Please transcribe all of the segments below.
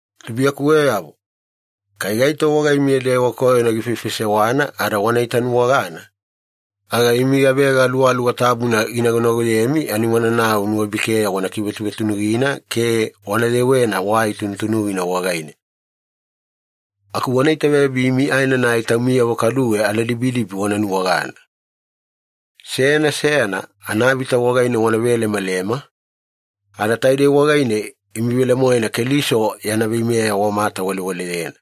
Tubuiyakuweyavo, kai gaito wagaimiya dewa koyona gifaifaisewana ada wana itanuwagana, aga imi gavega Aluwaluwa Tabuna ginagonagoyemi ani wananau nuwabikeya wana kivetunutunugina ke wana yewena wai tunutunugina wagaine. Aku wana itaveyabimi aenanai taumiyavo kaduwe aladibidibi wana nuwagana. Seyana seyana anavita wagaine wana velemalema, ada taidei wagaine imi velemoena Keliso yana veimeya wamatawalewaleyena.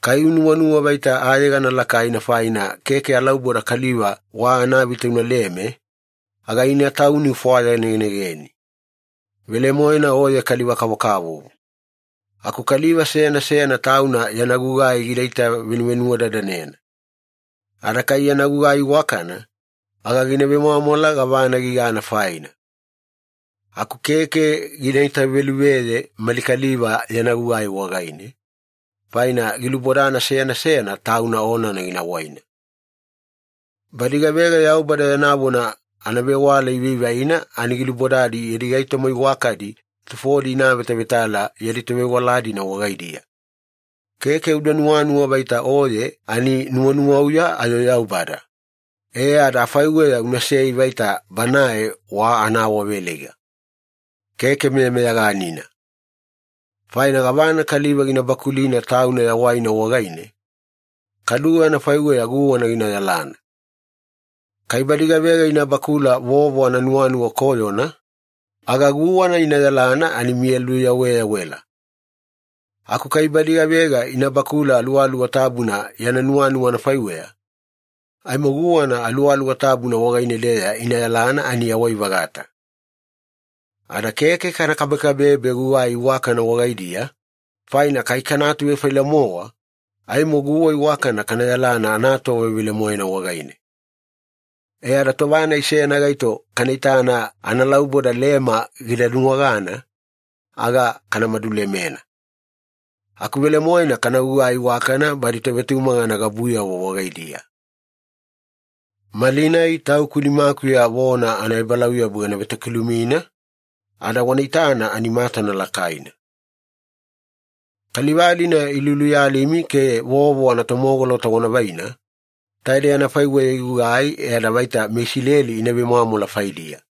Kai unuwanuwa vaita ayegana lakaina faina, keke alauboda kaliva wa anavita unaleme, aga ina tauni ufwayanegenegeni. Velemoena oye kaliva-kavokavovo. Aku kaliva seyana seyana tauna yana gugai gida itavenuvenuwadadanena. Ada kai yana gugai iwakana, aga gina vemwamwala gavana gigana faina. Aku keke gina itaveluveye mali kaliva yana gugai wagaine, faina gilubodana seyana seyana tauna onana gina waina. Badi gavega Yaubada yana vona anavewala ivaivaina, ani gilubodadi yadi gaitoma iwakadi tufodi ina avetavetala yadi tovewala-dina wagaidiya. Keke uda nuwanuwa vaita oye ani nuwanuwauya ayo Yaubada, e ada afaiweya unasei vaita Banae wa anaawaveleiga. Keke meyameyaganina. Faina gavana kaliva gina bakulina tauna yawaina wagaine, kaduwe anafaiweya guwana gina yalana. Kai badi gavega ina bakula vovo ananuwanuwa koyona, aga guwana ina yalana ani miya luyaweyawela. Aku kai badi gavega ina bakula Aluwaluwa Tabuna yana nuwanuwa anafaiweya, aimo guwana Aluwaluwa Tabuna wagaine-deya ina yalana ani yawai-vagata. Ada keke kana kabekabebe gugai iwakana wagaidiya, faina kai kana atuvefaila-mowa, aimo guwa iwakana kana yalana anatova velemoena wagaine. E ada tova-nai seyana gaito kana itana analauboda lema gida nuwagana, aga kana madulemena. Aku velemoena kana gugai iwakana badi tovetumagana gabuyavo wagaidiya. Malinai tauku nimakuya vona anaebalauyabu gana vetokilumina, ada wana itana ani matana lakaina. Kaliva-dina iluluyalimi ke vovo anatomogolota wana vaina, taidei anafaiweya igugai e ada vaita meIsileli ina vemwamwala faidiya.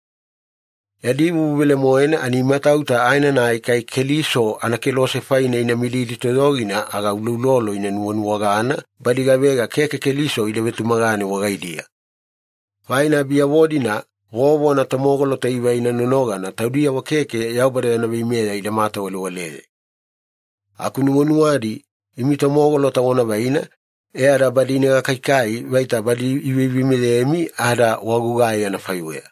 Yadi vuvu velemoena ani imatauta aenanai kai Keliso anakelose faine ina mididi toyogina, aga uloulolo ina nuwanuwagana badi gavega keke Keliso ida vetumagane wagaidiya. Faina biyavo-dina vovo anatomogolota ivaina nonogana taudiyavo keke Yaubada yana veimeya ida matawalewaleye. Aku nuwanuwadi imi tomogolota wana vaina e ada badi ina gakaikai vaita badi iveimeyemi ada wagugai anafaiweya.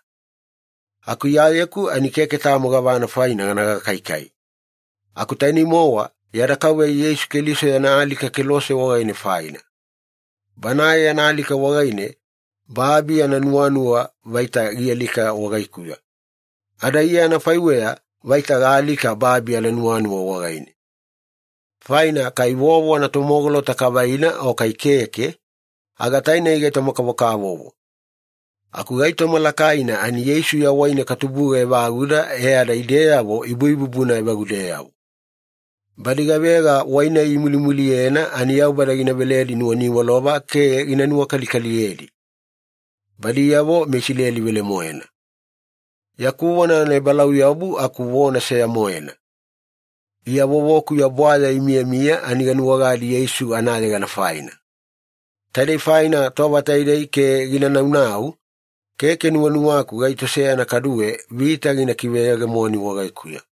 Aku Iyayeku ani keke tamo gavana faina gana gakaikai, aku tainei-mowa yada Kauveya Yeisu Keliso yana alika kelose wagaine faina. Banae yana alika wagaine babi ananuwanuwa vaita gialika wagaikuya, ada Iya anafaiweya vaita gaalika babi ananuwanuwa wagaine. Faina kai vovo anatomogolota kavaina o kai keke, aga tainei gaitoma-kavokavovo. Aku gaitoma lakaina ani Yeisu yawaine katubuga evaguda e ada ideyavo ibuibubuna evagudeyavo. Badi gavega wai-nai imulimuliyena ani Yaubada gina veledi nuwaniwalova ke gina nuwakalikaliyedi. Badiyavo meIsileli velemoena. Yaku vona anaebalauyabu aku vona seya-moena. Iya vovokuya bwaya imiyamiya ani ganuwagadi Yeisu anayegana faina. Taidei faina tova taidei ke gina naunau, keke nuwanuwaku gaito seyana kaduwe vita gina kiveyegemoni wagaikuya.